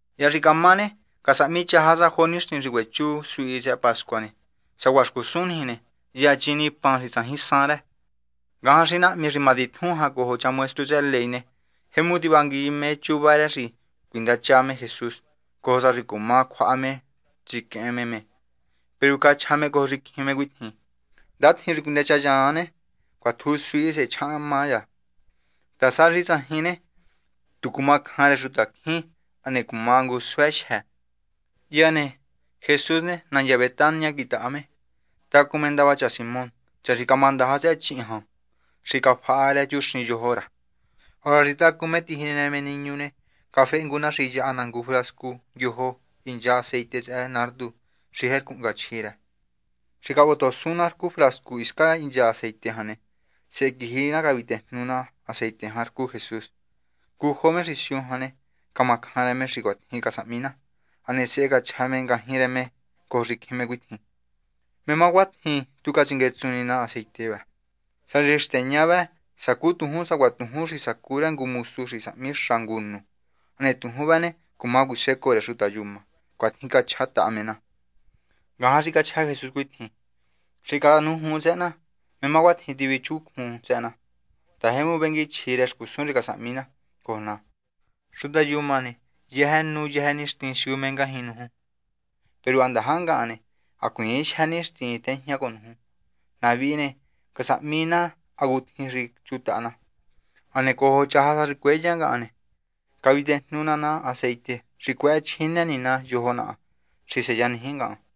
Hya xi camá ne, casahmi chaja sa jo nixtin xi cuechu suhi tsëhë pascua ne, sacuaha xcusun niji ne, hya chini pan xi tsajin san rë. Ngajan xi nahmi xi matitjun jan cojo cha maestru tsëhë ley ne, jemu tivangui me chuva rë xi cuindacha me Jesús, cojo sa xi cuma cjuaha me me tsiquehen me me. Peru cachja me cojo xicjin me cuitjin: ―Ndatjin xi cuinechanyan ne, cuatju suhi sehe chjahanhma cha, ta sá xi tsajin ne, tu cumacjan rë xutacjín hane cumá ngu suë jyë. Hya ne, Jesús ne, nandya Betania quitaha me. Tacun me ndava cha Simón, cha xi camandaja tsëhë chíhin cjan rë xi cafaha rë chuxin yojo rë. Hora xi tacun me tijinë me niñu ne, cafehe ngu na xi yaha na ngu frascu ndyojo, hincha aceite tsëhë nardo xi jercu hnga chjí rë. Hane xi cavotohosun na rcu frascu hiscan hincha aceite jan ne, sehe quiji cavitejnu na aceite jan rcun Jesús. Ngujo me xi siu jan ne, camacjan rë me xi cuatjin casahmi na. Hane sehe cachja me ngajñi rë me cojo xicjin me cuitjin: ―¿Mé má cuatjin tu catsinguetsun na aceite vë? Sá xi xteña vë, sacú tujún sacuaha tujún xi sacu rë ngu mosu xi casahmi xa ngu nu, hane tujún vëhë ne, cuma cuisecoo rë xuta yuma. ―Cuatjin cachjataha me na. Ngajan xi cachja Jesús cuitjin: ―Xi canujuun tsëhë na. ¿Mé má cuatjin tivichuncjun tsëhë na? ta, jemu venguichji rë xcusun xi casahmi na cojo ná. Xuta yuma ne, yëjë nu yëjë nixtin siu me ngajñi nuju. Peru ha ndaja ngahan ne, hacuiin jyë nixtin tejña cojo nuju. Na vihi ne, casahmi na hacutjin xi chutaha na. Hane cojo chaja sa xi cueya ngahan ne, cavitejnu ná na aceite xi cuëhëchjine ni na yojo naha xi seyaniji ngahan.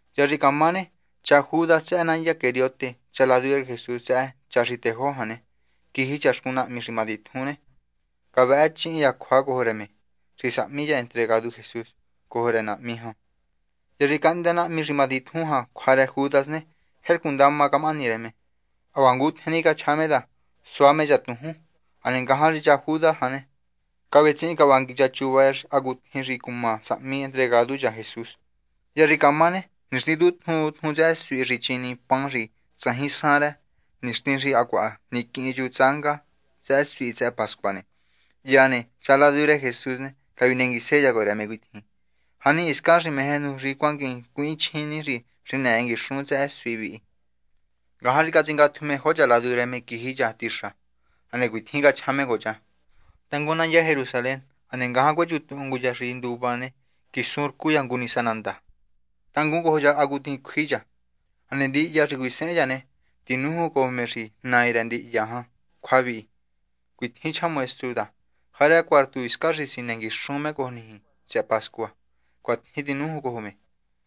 Hya xi camá ne, cha Judas tsëhë nandya Queriote, cha ladu rë Jesús tsëhë cha xi tejó jan ne, quiji cha xcun nahmi xi matitjun ne, cavëhë chihin cha cjua cojo rë me xi sahmi me entregadu cha Jesús cojo rë nahmi jan. Hya xi cahndë nahmi xi matitjun jan cjua rë Judas ne, jercu ndama camahani rë me. Hacuaha ngutjen ni cachja me ta, sua me cha tujún. Hane ngajan xi cha Judas jan ne, cavetsihin cavangui cha chuva rë hacutjin xi cuma sahmi entregadu cha Jesús. Hya xi camá ne, nixtin tjun tjun tsëhë suhi xi chini pan xi tsajin san rë, nixtin xi hacuaha niquihin chu tsánga tsëhë suhi tsëhë pascua ne, hya ne, cha ladu rë Jesús ne, cavinenguise cha cojo rë me cuitjin: ―¿Jani hiscan xi meje nuju xi cuanguin cuihinchjini xi xinëë nguixun tsëhë suhi vi? Ngajan xi catsingatju me jo cha ladu rë me quiji cha tixa. Hane cuitjin cachja me cojo cha: ―Tangun nandya Jerusalén. Hane ngajan cuechuntuhun ngu cha xi nduva ne, quisun rcu cha ngu nisa nandá. Tangun cojo cha hacutjin cjui cha. Hane ndihya xi cuisehen cha ne, tinújun cojo me xi nai rë ndihya jan cjua vihi: “Cuitjin chja maestru ta, ¿jarë cuartu hiscan xi sinë nguixun me cojo niji tsëhë pascua?” Cuatjin tinújun cojo me.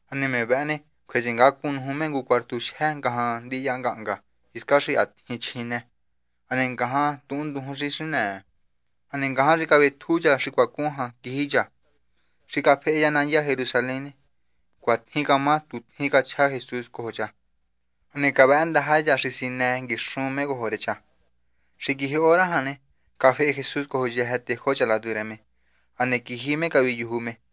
Hane me vëhë ne, cjue tsingacun nuju me ngu cuartu jyë ngajan ndihya ngahnga hiscan xi ha tjin chjine. Hane ngajan tuhunndujun xi xinëë. Hane ngajan xi cavetju cha xi cuacun jan quiji cha. Xi cafehe cha nandya Jerusalén ne, cuatjin camá tu tjin cachja Jesús cojo cha. Hane cavëhë ndaja cha xi sinë nguixun me cojo rë cha. Xi quiji hora jan ne, cafehe Jesús cojo yëjë tejó cha ladu rë me. Hane quiji me caviyuju me.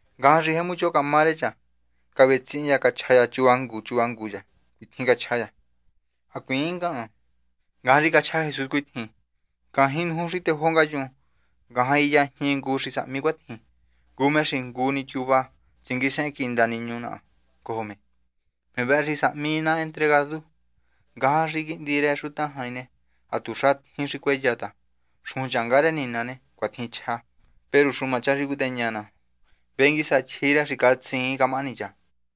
Ngajan xi jemu choho camá rë cha, cavetsihin cha cachja cha chuva ngu chuva ngu cha, cuitjin cachja cha: ―Hacuiin ngahan. Ngajan xi cachja Jesús cuitjin: ―Ngajñi nuju xi tejó ngayun, ngajan jiyajñi ngu xi sahmi cuitjin. Ngu me xi ngu ni tyuva tsinguísehen quinda niñu naha cojo ne, me vëhë xi sahmi ná me entregadu. Ngahan xi Quihndi rë Xuta Jain ne, hatuxa tjin xi cueyá ta, xujun rë Nina ne, cuatjin chja. Peru xuma cha xi cuiteña ná. Vengui sa chji rë sá xi catsiin camahani cha.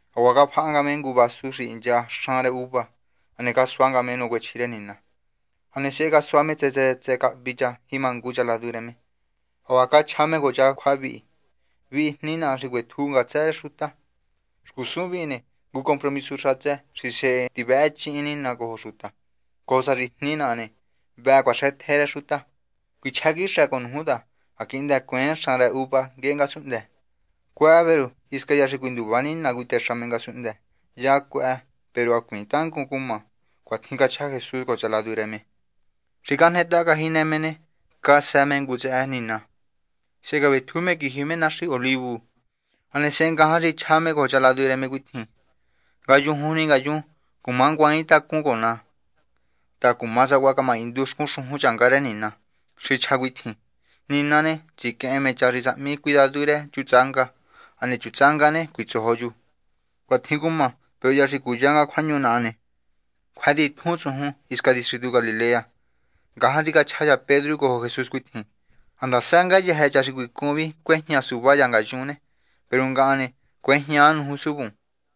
Hacuaha cafaha nga me ngu vasu xi hincha xan rë uva, hane casua nga me nacuechji rë Nina. Hane sehe casua me tsë tsë cahvi cha jima ngu cha ladu rë me. Hacuaha cachja me cojo cha cjua vihi: ―Vihi jni naha xi cuetju ná ngatsë rë xuta. Xcusun vihi ne, ngu compromisu xatsë xi sehe tivëhëchihin Nina cojo xuta cojo sa xi jni naha ne, vëhë cuaxëtje rë xuta. Cuichjá quixë cojo nuju ta ha quihndë cueen xan rë uva nguehe ngasunhndë. Cuëhë, peru hisca hya xi nduva Nina cuitexa me ngasunhndë, hya cuëhë, peru hacuiin tangun cumá. ―Cuatjin cachja Jesús cojo cha ladu rë me. Xi cajnetaha cajinë me ne, casë me ngu tsëhë Nina. Sehe cavetju me quiji me Naxi Olivu. Hane sehe ngajan xi chja me cojo cha ladu rë me cuitjin: ―Ngayujun ni ngayun cumanguaintacuun cojo ná ta cuma sacuaha camahindu xcun xujun rë Nina xi chja cuitjin: “Nina ne, tsiquehen me cha xi sahmi cuidadu rë chu tsánga. Hane chu tsánga ne, cuitsojo chu.” Cuatjin cumá, peru hya xi cúya nga cjuahñu naha ne, cjué titjun tsujun hiscan distritu Galilea. Ngajan xi cachja cha Pedru cojo Jesús cuitjin: ―Ha ndasa ngayëjë cha xi cuicun vi cuejña suva cha ngayun ne, peru ngahan ne, cuejñaa nuju suvun.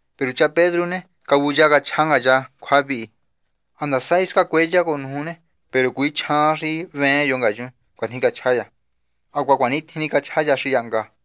Peru cha Pedru ne, cavuya cachja nga cha cjua vihi: ―Ha ndasa hisca cueya cojo nuju ne, peru cuichjaain xi hveen yo ngayun. ―Cuatjin cachja cha. Hacuaha cuanitjin ni cachja cha xi yahnga.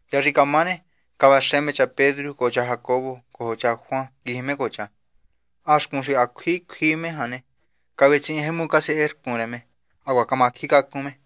Hya xi camá ne, cavaxë me cha Pedru cojo cha Jacobo cojo cha Juan, quiji me cojo cha. Ha xcun xi ha cjui cjui me jan ne, cavetsihin jemu casercun rë me, hacuaha macjincacun me.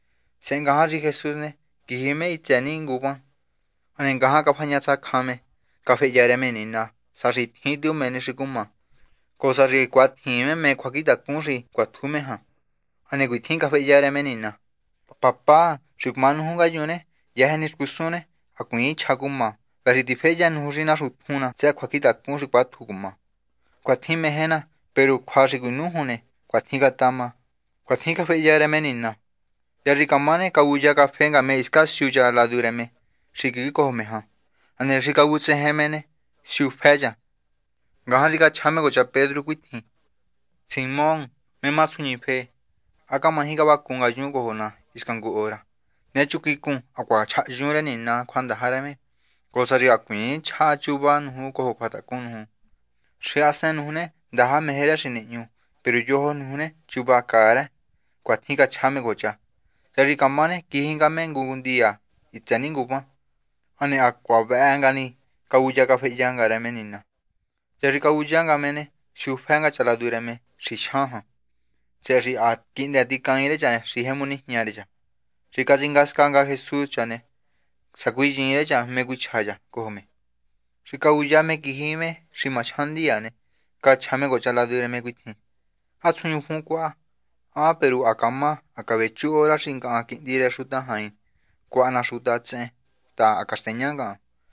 Sehe ngajan xi Jesús ne, quiji me hitsë ni nguvan. Hane ngajan cafañatsacjan me, cafehya rë me Nina sá xi tjin tu mé ni xi cumá cojo sa xi cuatjiin me cjuacjintacun xi cuatju me jan. Hane cuitjin cafehya rë me Nina: ―Papá. Xi cumá nuju ngayun ne, yëjë ni xcusun ne, hacuiin chja cuma. Vëhë xi tiféhya nuju xi naxuntjun ná tsëhë cjuacjintacun xi cuátju cumá. Cuatjin meje ná, peru cjua xi cuinújun ne, cuatjin catama. ―Cuatjin cafehya rë me Nina. Hya xi camá ne, cavuya cafehe nga me hiscan siu cha ladu rë me xi quijicojo me jan. Hane xi vutsejen me ne, siufë cha. Ngajan xi chja me cojo cha Pedru cuitjin: ―Simón, ¿mé má tsjuñife? ¿Há camaji cavacun ngayun cojo ná hisca ngu hora? Nechun quicun, hacuaha chjahyun rë Nina cjuandaja rë me, cojo sa xi hacuiin chjaha chuva nuju cojo cjuatacun nuju. Xahasen nuju ne, ndaja meje rë xi nihñu, peru yojo nuju ne, chuva caa rë. ―Cuatjin cachja me cojo cha. Hya xi camá ne, quiji nga me ngu ndiya hitsë ni nguvan. Hane ha cjua vëhë nga ni cavuya cafehya rë me Nina. Hya xi cavuya nga me ne, siufë nga cha ladu rë me xi jyan jan, tsëhë xi ha quihndë ticaain rë cha xi jemu nijña rë cha. Xi catsingasca Jesús cha ne, sacuinyiin rë cha mé cuichja cha cojo me. Xi cavuya me xi quiji me má jyan ndiya ne, cachja me cojo cha ladu rë me jan cuitjin: ―Ha tsjuñufun cuaha. Juun, peru ha camá. Ha cavechu hora xi ngahan, Quihndi rë Xuta Jain, cjuaha ná xuta tsehen ta, ha caxteña ngahan.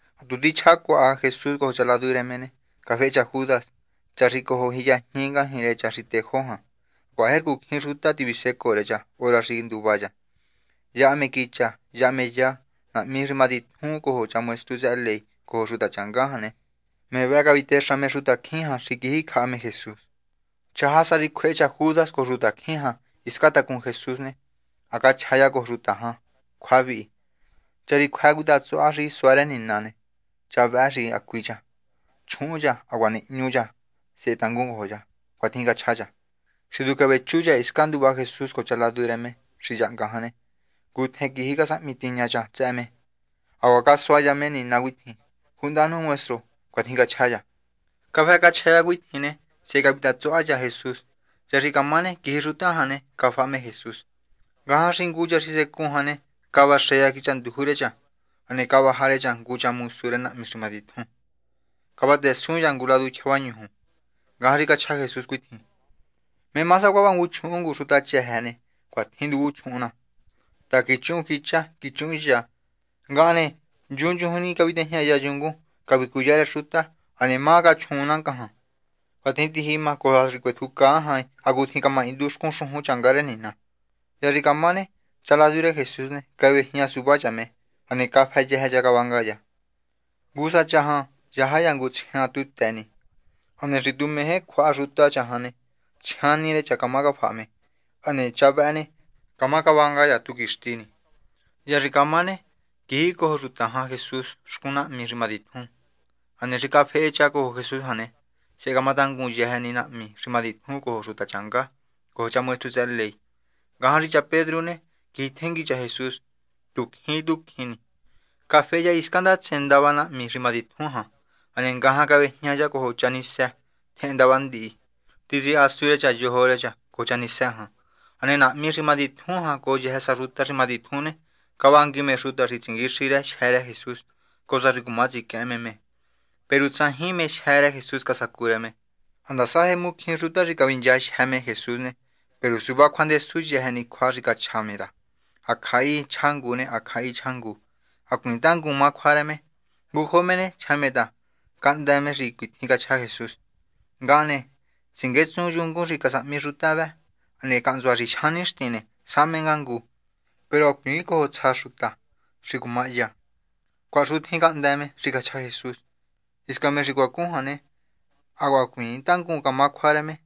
Ha tu tichja cuaha Jesús cojo cha ladu rë me ne, cafehe cha Judas, cha xi cojo jiyajñi ngajñi rë cha xi tejó jan. Hacuaha jercu cjín xuta tivisecoo rë cha hora xi nduva cha. Yaha me quicha. Yaha me ya. Nahmi xi matitjun cojo cha maestru tsëhë ley cojo xuta changá jan ne, me vëhë cavitexa me xutacjín jan xi quiji jaha me Jesús. Chaja sa xi cjuehe cha Judas cojo xutacjín jan hiscan tacun Jesús ne, ha cachja cha cojo xuta jan cjua vihi: ―Cha xi cjuë́ cuitátsuha xi suá rë nina ne, cha vëhë xi hacui cha. Chjuhun cha, hacuaha nihñu cha, sehe tangun cojo cha. ―Cuatjin cachja cha. Xi tu cavechu cha hiscan nduva Jesús cojo cha ladu rë me xi yahnga jan ne, ngutjen quiji casahmi tiña cha tsëhë me, hacuaha casua cha me nina cuitjin: ―Cuhndanu, Maestro. ―Cuatjin cachja cha. Cafë cachja cha cuitjin ne, sehe cavitatsuha cha Jesús. Hya xi camá ne, quiji xuta jan ne, cafaha me Jesús. Ngajan xi ngu cha xi secun jan ne, cavaxë cha quicha nduju rë cha, hane cavaja rë cha ngu cha mosu rë nahmi xi matitjun ne, cavatësun cha ngu ladu tyjavañuju. Ngajan xi cachja Jesús cuitjin: ―¿Mé má sacuaha vangun chjuhun xuta chëjë ne, cuatjin nduvun chjuhun ná? ta, quichuhun quicha quichuhun ya. Ngahan ne, nchunchujun ni cavitejñaya yungun xi matitjun, cavicuyá rë xuta, hane ¿mé má cachjuun ná ngajan? Juun, peru cuatjin tijima cojo sa xi cuetjucaa jain hacutjin camahindu xcun xujun rë Nina. Hya xi camá ne, cha ladu rë Jesús ne, cavejña suva cha me, hane cafë yëjë cha cavanga cha. Ngu sa cha jan yaja cha ngu tsjian tu të ni. Hane xi tu meje cjuaha xuta cha jan ne, tsjian ni rë cha cama cafaha me. Peru cha vëhë ne, cama cavanga cha tu quixti ni. Hya xi camá ne, quijicojo xuta jan Jesús xcun nahmi xi matitjun. Hane xi cafehe cha cojo Jesús jan ne, sehe camatangun yëjë ni nahmi xi matitjun cojo xuta changá cojo cha maestru tsëhë ley. Ngajan xi cha Pedru ne, quijitjengui cha Jesús tu cjin tu cjin ni. Cafehe cha hiscan ndatsen ndava nahmi xi matitjun jan. Hane ngajan cavéjña cha cojo cha nísë tjehen ndava ndihi, tsihasu rë cha yojo rë cha cojo cha nísë jan. Hane nahmi xi matitjun jan cojo yëjë sa xuta xi matitjun ne, cavangui me xuta xi tsinguixi jyë́ rë Jesús, cojo sa xi cuma tsiquehen me me. Peru tsajin mé jyë́ rë Jesús casacu rë me. Ha ndasa jemu cjín xuta xi cavinchajyë me Jesús ne, peru suva cjuandesu yëjë ni cjua xi cachja me ta, hacjahi chja ngu ne, hacjahi chja ngu. Hacuiin tangun má cjua rë me. Ngujo me ne, chja me ta cahndë me xi cuitjin cachja Jesús: “Ngahan ne, tsinguétsun yungun xi matitjun xi casahmi xuta vë, hane cahntsua xi jyan nixtin ne, sahme nga ngu. Peru hacuiin cojo tsja xuta xi cuma hya.” Cuahaxutjin cahndë me xi cachja Jesús. Hisca me xi cuacun jan ne, hacuaha hacuiin tangun camá cjua rë me.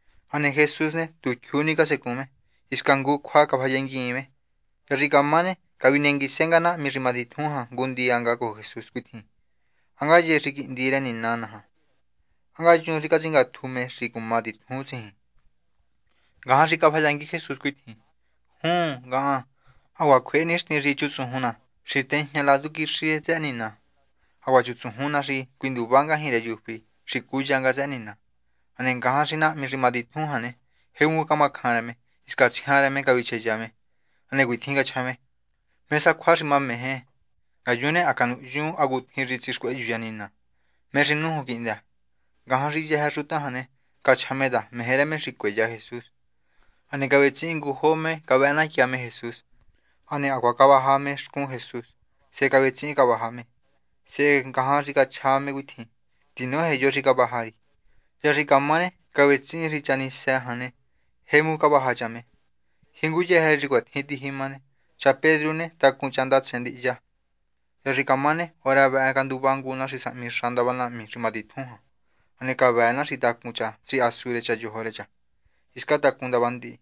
Hane Jesús ne, tu jyuu ni casecun me. Hisca ngu cjua cafayanguiin me. Hya xi camá ne, cavinenguise nga nahmi xi matitjun jan ngu ndiya cojo Jesús cuitjin: ―¿Há ngaye xi Quihndi rë Nina naja? ¿Há ngaye xi catsingatju me xi cumá titjun tsijin? Ngajan xi cafayangui Jesús cuitjin: ―Juun, ngahan. Hacuaha cjuehe nixtin xi chutsujun ná xi tejña ladu quixi tsëhë Nina. Hacuaha chutsujun ná xi cuinduva ngajñi rë yufí, xi cúya nga tsëhë Nina. Hane ngajan xi nahmi xi matitjun jan ne, jemu camacjan rë me ne, hisca tsjian rë me cavicheya me. Hane cuitjin cachja me: ―¿Mé sa cjua xi mameje? Ngayun ne, ha canuhyun hacutjin xi tsixcuehyu cha Nina. ¿Mé xi nújun quihndë? Ngajan xi yëjë xuta jan ne, cachja me ta meje rë xi cueya Jesús. Hane cavetsihin ngujo me cavëhë natya me Jesús. Hane hacuaha cavatsa me xcun Jesús, sehe cavetsihin cavaja me. Sehe ngajan xi cachja me cuitjin: ―Tinoje yo xi cavaja ri. Hya xi camá ne, cavetsihin xi cha nísë jan ne, jemu cavaja cha me. Jinguyëjë rë xi cuatjin tijima ne, cha Pedru ne, tacun cha ndatsen ndihya. Hya xi camá ne, hora vëhë canduva ngu na xi sahmi xa ndava nahmi xi matitjun jan. Hane cavëë na xi tacun cha Pedru tsihasu rë cha yojo rë cha hiscan tacun ndava ndihi.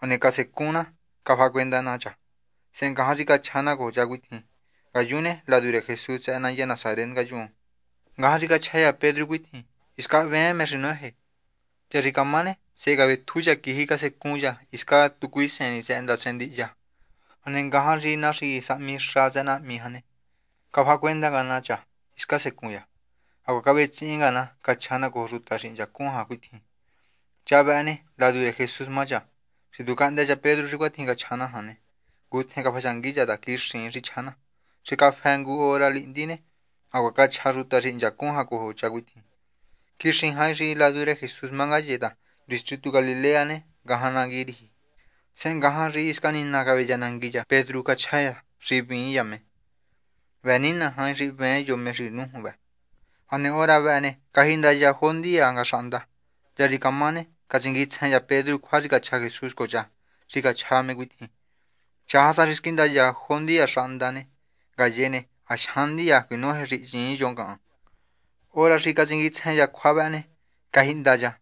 Hane casecun na cafahacuenda na cha. Sehe ngajan xi cachja na cojo cha cuitjin: ―Ngayun ne, ladu rë Jesús tsëhë nandya Nasaret ngayun. Ngajan xi cachja cha Pedru cuitjin: ―Hisca hveen mé xi noje. Hya xi camá ne, sehe cavetju cha quiji cha casecun cha hiscan tu cuiseen ni tsëhë ndatsen ndihya. Hane ngajan xi na xi sahmi xa tsëhë nahmi jan ne, cafahacuenda nga na cha hiscan quisecun cha. Hacuaha cavetsihin nga na cachja na cojo xuta xi hinchacun jan cuitjin: ―Cha vëhë ne, ladu rë Jesús má cha. Xi tu cahndë cha Pedru xi cuatjin cachja na jan ne, ngutjen cafayangui cha xi quixiin xi chja na. Xi cafë ngu hora lihndi ne, hacuaha cachja xuta xi hinchacun jan cojo cha cuitjin: ―Quixi jain xi ladu rë Jesús má ngaye ta distritu Galilea ne, ngajan nangui riji. Sehe ngajan xi hisca Nina caveyanangui cha Pedru ne, cachja cha xi hvíin cha me, cuitjin cachja cha: ―Vëë Nina jain xi hveen yo me xi nújun vë. Hane hora vëhë ne, cajihnda xahnda. Hya xi camá ne, catsinguitsjen cha Pedru cjua xi cachja Jesús cojo cha xi cachja me cuitjin: “Chaja sa xi squihndajo xahnda ne, ngaye ne, ha jyan ndiya cuinoje xi hyiin yo ngahan.” Hora xi catsinguitsjen cha cjua vëhë ne, cajihnda cha.